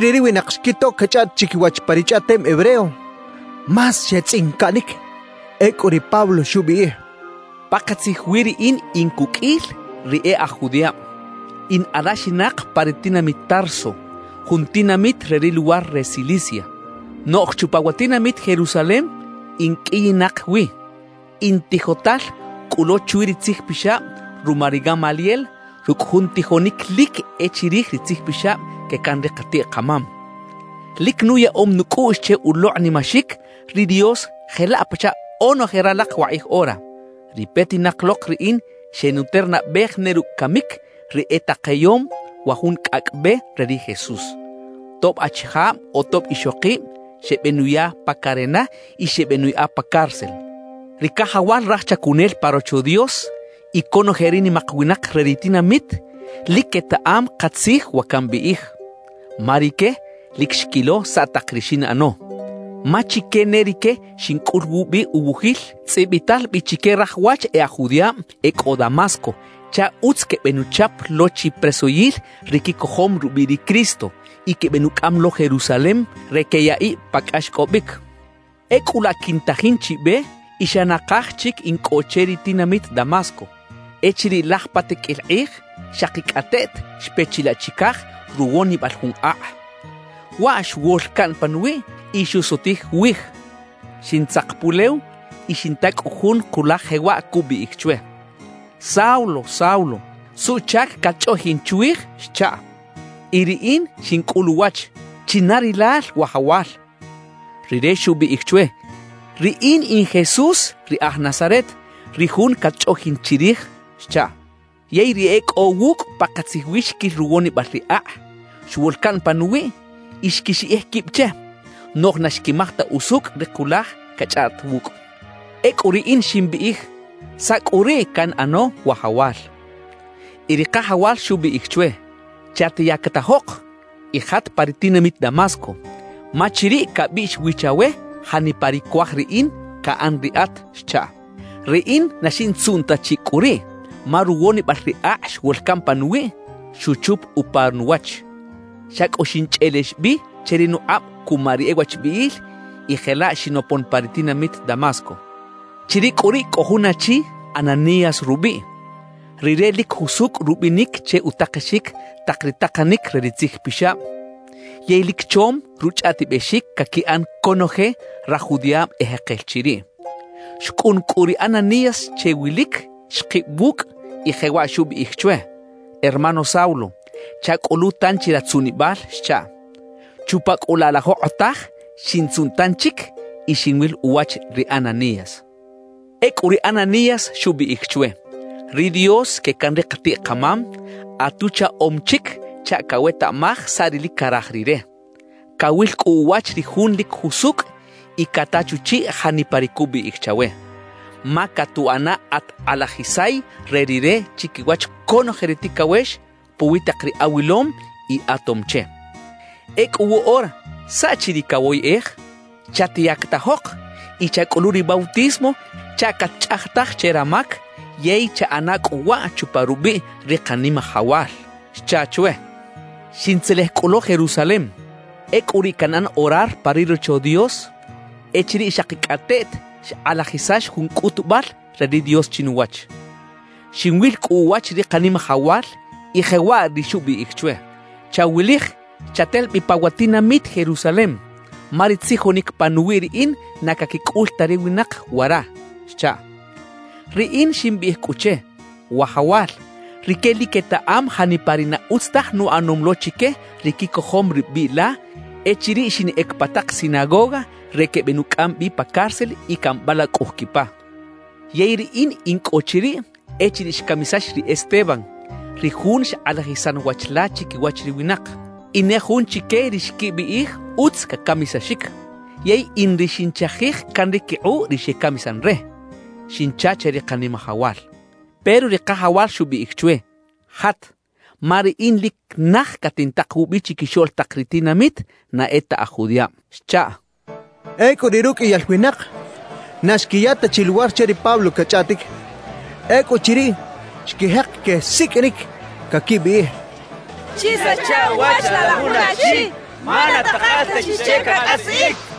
Echiriꞌ ri winak xquito cachꞌaꞌt chiquiwach pa ri chꞌaꞌtem hebreo, más xetzꞌincaꞌnic. Ecꞌu ri Pablo xubiꞌij: «Pakatzij wi riꞌin in cuqꞌuil ri e aj judiꞌab. In alaxinak pa ri tinamit Tarso, jun tinamit re ri luwar re Cilicia; noꞌj chupa wa tinamit Jerusalem in qꞌuiyinak wi. In tijotal cꞌu lo chwi ri Tzij Pixab ruma ri Gamaliel rucꞌ jun tijonic lic e chirij ri tzijpixab que can ri katiꞌ-kamam. Lic nuyaꞌom nucꞌuꞌx che ulokꞌnimaxic ri Dios jelaꞌ pachaꞌ onoje ralak wakꞌij ora. »Ri petinak lok riꞌin xenuternabej ne rucꞌ camic ri etakeyom wa jun Cꞌacꞌ Be re ri Jesús. Tob achijab o tob ixokib xebenuya pa carena y xebeꞌnuyaꞌa pa cárcel. Ri cajawal raj chacunel pa Rocho Dios y conoje ri nimak winak re ri tinamit lic quetaꞌam katzij wa cambiꞌij, ma rique lic xquilo saꞌ tak ri xinꞌano. Ma chique ne rique xincꞌul wubi uwujil, tzꞌibital bi chique raj wach e aj judiꞌab e cꞌo Damasco chaꞌ utz quebenuchap lo chi presoyil ri quicojom rubiꞌ ri Cristo y quebenucꞌam lo Jerusalem re queyaꞌiꞌ pa cꞌaxcꞌobic. »Ecꞌu laꞌ quintajin chi be y xa nakaj chic in cꞌo che ri tinamit Damasco, echiriꞌ laj pa tiqꞌuil kꞌij xakicꞌateꞌt xpe chilaꞌ chicaj ruwonibal jun akꞌ. Waꞌ xwol caꞌn panuwiꞌ y xusutij wij. Xintzak pulew y xinta cꞌu jun kulaj jewaꞌ cubiꞌij chwe: “Saulo, Saulo, ¿suꞌchac catchꞌoꞌjin chwij?” xchaꞌ. »Y riꞌin xincꞌul uwach: “¿China rilal, Wajawal?” Rire xubiꞌij chwe: “Riꞌin in Jesús ri aj Nazaret, ri jun catchꞌoꞌjin chirij” xchaꞌ. »Yey ri e cꞌo wucꞌ pakatzij wi xquil ruwonibal ri akꞌ xwol caꞌn panuwiꞌ y xquixiꞌij quib che; noꞌj na xquimaj ta usucꞌ ri kulaj cachꞌaꞌt wucꞌ. »Ecꞌu riꞌin ximbiꞌij: “¿Saꞌ cꞌu riꞌ canꞌano, Wajawal?” »Y ri Kajawal xubiꞌij chwe: “Chatyactajok y jat pa ri tinamit Damasco, ma chiriꞌ cabiꞌx wi chawe janipa ri cuaj Riꞌin caꞌan riꞌat” xchaꞌ. »Riꞌin na xintzuꞌn ta chi cꞌu riꞌ ma ruwonibal ri akꞌ xwol caꞌn panuwiꞌ, xuchup upa nuwach. Xa cꞌu xinchꞌelex bi che ri nukꞌab cuma ri e wachbiꞌil, y jelaꞌ xinopon pa ri tinamit Damasco. »Chiriꞌ cꞌu riꞌ cꞌo jun achi Ananías rubiꞌ; rire lic jusucꞌ rubinic che utakexic tak ri takanic re ri Tzij Pixab, yey lic chom ruchꞌaꞌtibexic caquiꞌan conoje raj judiꞌab ejekel chiriꞌ. Xcꞌun cꞌu ri Ananías che wilic, xkib wucꞌ, y jewaꞌ xubiꞌij chwe: “Hermano Saulo, chacꞌulu tanchi ratzuꞌnibal” xchaꞌ. Chupa cꞌu laꞌ la jokꞌotaj, xintzuꞌn tanchic y xinwil uwach ri Ananías. »Ecꞌu ri Ananías xubiꞌij chwe: “Ri Dios que can ri katiꞌ-kamam, atuchaꞌom chic chaꞌ cawetaꞌmaj saꞌ ri lic caraj Rire, cawil cꞌu uwach ri Jun lic jusucꞌ y cata chuchiꞌ janipa ri cubiꞌij chawe. Ma catuꞌana at kꞌalajisay re Rire chiquiwach conoje ri ticawex puwi tak ri awilom y atom che. Ecꞌu woꞌora, ¿saꞌ chi ri cawoyꞌej? Chatyactajok y chacꞌulu ri bautismo chaꞌ catchꞌajtaj che ramac; yey chaꞌana cꞌu waꞌ chupa rubiꞌ ri Kanimajawal” xcha chwe. »Xintzelej cꞌu lo Jerusalem. Ecꞌu riꞌ canꞌan orar pa ri Rocho Dios echiriꞌ xakicꞌateꞌt xkꞌalajisax jun cꞌutubal re ri Dios chinuwach. Xinwil cꞌu uwach ri Kanimajawal y jewaꞌ ri xubiꞌij chwe: “Chawilij, chatel bi pa wa tinamit Jerusalem ma ri tzijonic panuwiꞌ Riꞌin na caquicꞌul ta ri winak wara” xchaꞌ. »Riꞌin ximbiꞌij cꞌu che: “Wajawal, rique lic quetaꞌam janipa ri na utz taj nuꞌanom lo chique ri quicojom ri biꞌ la echiriꞌ xinꞌec pa tak sinagoga re quebenucꞌam bi pa cárcel y cambalacꞌuj quipa. Yey riꞌin in cꞌo chiriꞌ echiriꞌ xcamisax ri Esteban, ri jun xkꞌalajisan wach la chiquiwach ri winak. In ne jun chique ri xquibiꞌij utz cacamisaxic; yey in ri xinchajij can ri quikꞌuꞌ ri xecamisan re” xincha che ri Kanimajawal. »Pero ri Kajawal xubiꞌij chwe: “Jat, ma Riꞌin lic naj catintak wubi chiquixoꞌl tak ri tinamit na e ta aj judiꞌab”» xchaꞌ. Ecꞌu riꞌ ruqꞌuiyal winak, na xquiya ta chi luwar che ri Pablo cachꞌaꞌtic. Ecꞌuchiriꞌ, xquijek quesiqꞌuinic, caquibiꞌij: «Chisacha uwach laꞌ la jun achi ma na takal ta chi che cacꞌasiꞌic» quechaꞌ.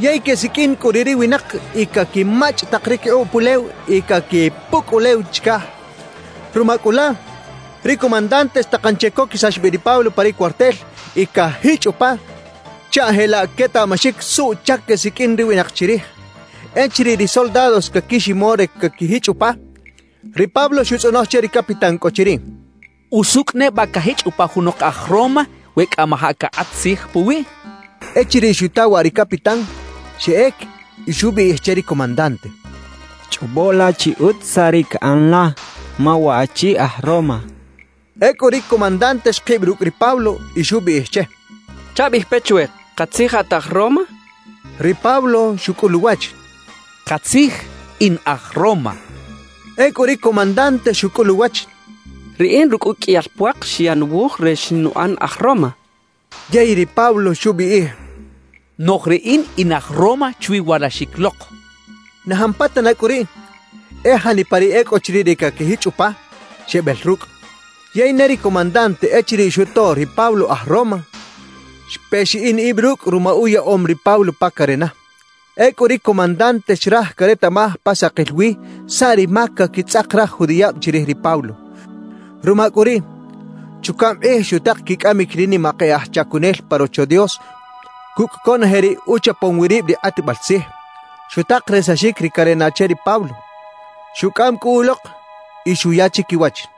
Yey quesiqꞌuin cꞌu riꞌ ri winak y caquimachꞌ tak ri quikꞌuꞌ pulew y caquipucꞌ ulew chicaj. Ruma cꞌu laꞌ, ri comandante xtakan che coquisax bi ri Pablo pa ri cuartel y cajichꞌ upa chaꞌ jelaꞌ quetaꞌmaxic suꞌchac quesiqꞌuin ri winak chirij. Echiriꞌ ri soldados caquiximo re caquijichꞌ upa, ri Pablo xutzꞌonoj che ri capitán cꞌo chiriꞌ: —¿Usucꞌ neba cajichꞌ upa junok aj Roma we cꞌamajaꞌ cakꞌat tzij puwiꞌ? —xchaꞌ. Echiriꞌ xuta waꞌ ri capitán, xeꞌec y xubiꞌij che ri comandante: —Chꞌobo la chi utz saꞌ ri caꞌan la, ma waꞌchi aj Roma —xchaꞌ. Ecꞌu ri comandante xkib rucꞌ ri Pablo y xubiꞌij che: —Chabiꞌij pe chwe: ¿Katzij at aj Roma? —xcha che. Ri Pablo xucꞌul uwach: —Katzij, in aj Roma —xchaꞌ. Ecꞌu ri comandante xucꞌul uwach: —Riꞌin rucꞌ uqꞌuiyal puak xyaꞌ nuwuj re xinuꞌan aj Roma —xchaꞌ. Yey ri Pablo xubiꞌij: —Noꞌj riꞌin, in aj Roma chwi walaxic lok —xchaꞌ. Na jampatana cꞌu riꞌ, e janipa ri e cꞌo chiriꞌ re caquijichꞌ upa, xebel rucꞌ. Yey ne ri comandante echiriꞌ xuto ri Pablo aj Roma, xpe xiꞌin ib rucꞌ ruma uyaꞌom ri Pablo pa carena. Ecꞌu ri comandante xraj caretaꞌmaj pa sakil wi saꞌ ri mac caquitzꞌak raj judiꞌab chirij ri Pablo. Ruma cꞌu riꞌ, chucaꞌm kꞌij xutak quicꞌamic ri nimak e aj chacunel pa Rocho Dios cucꞌ conoje ri uchapom wi rib ri kꞌatbal tzij. Xutak resaxic ri carena che ri Pablo; xucꞌam cꞌu ulok y xuya chiquiwach.